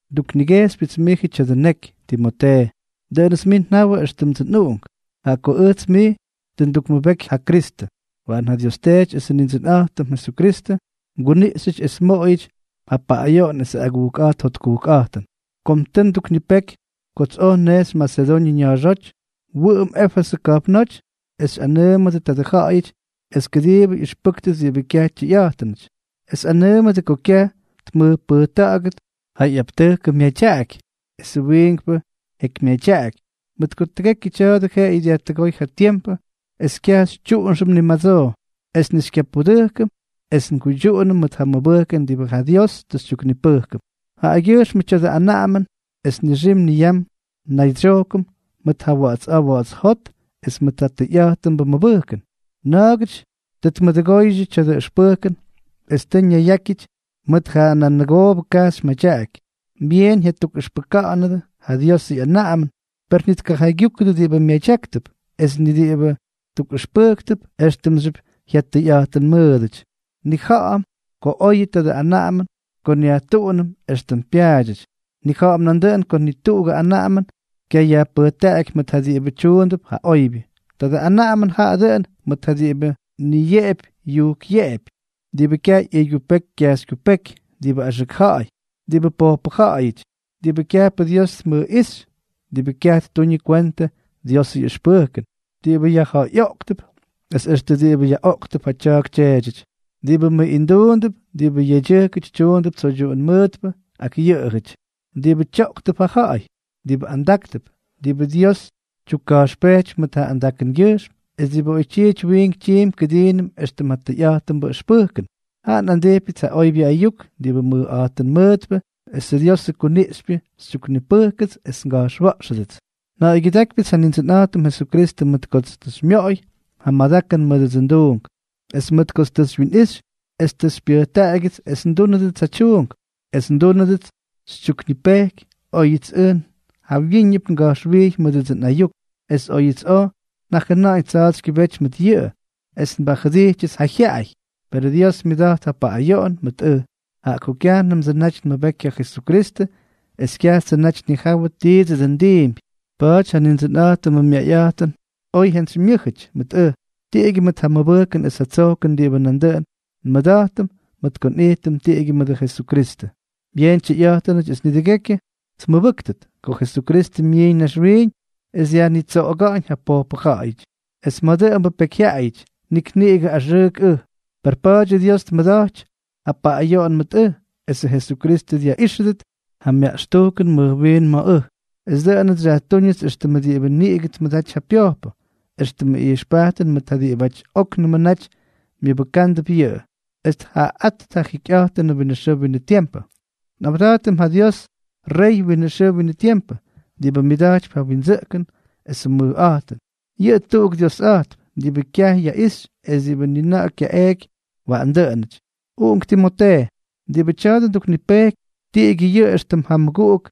nduknigejxypyʉts mijʉ tya̱dʉ neky, Timotee. Dʉꞌʉnʉts mij njawʉ éxtʉmdsʉ nꞌuꞌunk, jaꞌa ko ʉjts mij tʉ ndukmʉbeky ja Kristʉ. Waꞌan ja Dios Teety esʉ Nindsʉnꞌa̱jtʉm Jesukristʉ mguniꞌxyʉty es mmoꞌoyʉty ja paꞌꞌayoꞌon esʉ agujkꞌa̱jt jotkujkꞌa̱jtʉn. Kom tʉ nduknipeky kots oj nnejxy Masedoñʉ ña̱a̱xóty, wʉꞌʉm Éfesʉ ka̱jpnóty es xyꞌanʉʉmʉdʉ tadʉ ja̱ꞌa̱yʉty es kʉdiibʉ yaꞌʉxpʉ́kʉt diꞌibʉ kyaj tyʉyꞌa̱jtʉnʉty, es anʉʉmʉdʉ ko kyaj tmʉjpʉjta̱ꞌa̱gʉt ja ꞌyaptʉjkʉ madyaꞌaky esʉ wiinkpʉ jekymyadyaꞌaky, mʉt ko tʉgekyʉ tya̱a̱dʉ jeꞌeyʉ dyajtʉgóy ja tiempʉ es kyaj xytyuꞌunxʉm ni madsoo, es ni xykyapudʉjkʉm es nguydyuꞌunʉm mʉt ja mʉbʉjkʉn diꞌibʉ ja Dios tʉ xytyuknipʉjkʉm. Jaꞌagyʉjxmʉ tya̱dʉ anaꞌamʉn es nixim niyam nnaydsyojkʉm mʉt ja wa̱ꞌa̱ts a̱a̱ wa̱ꞌa̱ts jot es mʉʉt ja tʉyꞌa̱jtʉnbʉ mʉbʉjkʉn. Na̱a̱gʉty tʉ tmʉduꞌudʉgóydyʉ tya̱dʉ ʉxpʉjkʉn es tʉ ñaygyʉyákyʉty mʉt ja nanʉgoobʉ kajxy madyaꞌaky. Byeen jyatukꞌʉxpʉka̱ꞌa̱ndʉ ja Diosʉ ꞌyanaꞌamʉn, per ni tkajaygyúkʉdʉ diꞌibʉ myadyáktʉp es ni diꞌibʉ tukꞌʉxpʉjktʉp éxtʉmxyʉp jyatʉyꞌa̱jtʉnmʉʉdʉty. Nnija̱ꞌa̱m ko oyʉ tadʉ anaꞌamʉn ko nyajtuꞌunʉm éxtʉm pyaadyʉty. Nnija̱ꞌa̱m nandʉꞌʉn ko ni tuꞌugʉ anaꞌamʉn kyayajpʉjtaꞌaky mʉt ja diꞌibʉ tyuundʉp ja oybyʉ. Tadʉ anaꞌamʉn jaꞌa dʉꞌʉn mʉt ja diꞌibʉ niyeꞌepy yujkꞌyeꞌepy, diꞌibʉ kyaj ꞌyʉygyupeky kyajxykyupéky, diꞌibʉ axʉk ja̱ꞌa̱yʉty, diꞌibʉ pojpʉ ja̱ꞌa̱yʉty, diꞌibʉ kyajpʉ Dios tmʉjꞌíxy, diꞌibʉ kyaj ttuñʉ kwentʉ Diosʉ ꞌyʉxpʉjkʉn, diꞌibʉ yajja̱ꞌa̱yꞌoꞌktʉp, es extʉ diꞌibʉ yaꞌoꞌktʉp ja tya̱a̱k tyeedyʉty, diꞌibʉ mʉꞌinduundʉp, diꞌibʉ yedyʉjkʉty tyuundʉp tsoydyuꞌun mʉʉtpʉ ak yʉꞌʉjʉty, diꞌibʉ tyoꞌktʉp ja ja̱ꞌa̱y, diꞌibʉ andáktʉp, diꞌibʉ Dios tyukka̱jxpejtypy mʉt ja andakʉngyʉjxm, es diꞌibʉ oytyiity wiink tyiimpy kʉdiinʉm éxtʉm ja tʉyꞌa̱jtʉnbʉ ʉxpʉjkʉn. Jaꞌa nꞌandijpyʉts ja oybyʉ ayuk diꞌibʉ mʉjꞌa̱jtʉn mʉʉtpʉ esʉ Diosʉ kuniꞌxypyʉ xytyuknipʉjkʉts es nga̱jxwa̱ꞌxʉdʉts. Nja̱ꞌa̱ygyʉdákypyʉts ja Nindsʉnꞌa̱jtʉm Jesukristʉ mʉt kots tʉ xymyoꞌoy ja madakʉn mʉdʉdsʉ nduunk, es mʉt kots tʉ xywyinꞌixy es tʉ xypyʉjtaꞌagyʉts es ndúnʉdʉts ja tyuunk, es dʉꞌʉnʉts tʉ xytyuknipeky óyʉts ʉj jawyíñʉp ngamʉjꞌijxy mʉdʉdsʉ nꞌayuk, es óyʉts oj njajʉna̱ꞌa̱ñ tsa̱a̱tsykyʉbéty mʉt yʉꞌʉ, es nbajʉdijtyʉts ja jyaꞌay. Perʉ Dios myʉda̱jt ja paꞌꞌayoꞌon mʉt ʉj, jaꞌa ko kyajnʉmdsʉ naty nmʉbeky ja Jesukristʉ es kyajtsʉ naty nnijawʉ tiidsʉ dʉꞌʉn ndiimpy. Pa̱a̱ty ja Nindsʉnꞌa̱jtʉmʉ myayꞌa̱jtʉn oy jyantsymyʉ́jʉty mʉt ʉj, tiꞌigyʉ mʉt ja mʉbʉjkʉn es ja tsojkʉn diꞌibʉ nandʉꞌʉn nmʉda̱jtʉm mʉt ko nꞌijtʉm tiꞌigyʉ mʉdʉ Jesukristʉ. Byeen tyʉyꞌa̱jtʉnʉty, es nidʉgekyʉ tmʉbʉ́ktʉt, ko Jesukristʉ myiiñ naxwiiñ es dyajnitsoꞌoga̱ꞌa̱ñ ja pojpʉ ja̱ꞌa̱yʉty, es ma̱ dʉꞌʉmbʉ pyekyjyaꞌayʉty nik niꞌigʉ axʉʉk ʉj. Per pa̱a̱dyʉ Dios tmʉda̱jty ja paꞌꞌayoꞌon mʉt ʉj, esʉ Jesukristʉ dyaꞌíxʉdʉt ja myaꞌxtujkʉn mʉj wiin ma̱ ʉj. Es dʉꞌʉnʉts xyajtúñʉts éxtʉmʉ diꞌibʉ niꞌigʉ tmʉdaty ja pyojpʉ, éxtʉmʉ ijxpajtʉn mʉt ja diꞌibʉty óknʉmʉ naty myʉbʉkándʉp yʉꞌʉ, es tjaꞌaꞌáttʉt ja jikyꞌa̱jtʉnʉ winʉ xʉʉ winʉ tiempʉ. Nꞌawda̱jtʉm ja Dios, rey winʉ xʉʉ winʉ tiempʉ, diꞌibʉ myʉda̱jtypy ja windsʉꞌkʉn esʉ mʉjꞌa̱jtʉn, yʉꞌʉ tuꞌuk Diosꞌa̱jtp, diꞌibʉ kyaj yaꞌixy es diꞌibʉ nina̱ꞌa̱ kyaꞌeeky. Waꞌan dʉꞌʉnʉty. Uꞌunk Timotee, diꞌibʉ tya̱a̱dʉ nduknipejkypy, tiꞌigyʉ yʉꞌʉ éxtʉm ja mʉguꞌuk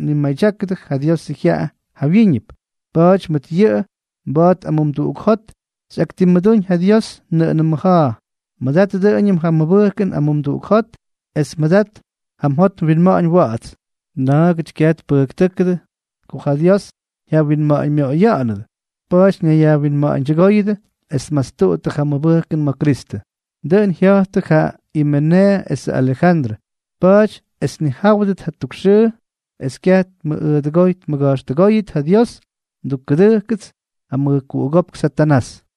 mnimaydyákʉdʉ ja Diosʉ jyaꞌa jawyíñʉp. Pa̱a̱ty mʉt yʉꞌʉ mba̱a̱t amumduꞌuk jot xyꞌaktimmʉdúñ ja Dios nʉꞌʉnʉ mmʉja̱a̱. Mʉdat dʉꞌʉñʉm ja mʉbʉjkʉn amumduꞌuk jot es mʉdat ja mjot mwinma̱ꞌa̱ñ wa̱ꞌa̱ts. Na̱a̱gʉty kyaj tpʉjktʉjkʉdʉ ko ja Dios jyawinma̱ꞌa̱ñmyoꞌoya̱ꞌa̱nʉdʉ. Pa̱a̱ty ñayyajwinma̱ꞌa̱ñdyʉgooyʉdʉ es tmastuttʉ ja mʉbʉjkʉn ma̱ Kristʉ. Dʉꞌʉn jya̱jttʉ ja Imeneeʉ esʉ Alejandrʉ. Pa̱a̱ty es tnijáwʉdʉt jatuk xʉʉ es kyaj tmʉꞌꞌʉdʉgoy tmʉga̱jxtʉgóyʉt ja Dios, ndukkʉdʉjkʉts ja mʉjkuꞌugópk Satanás.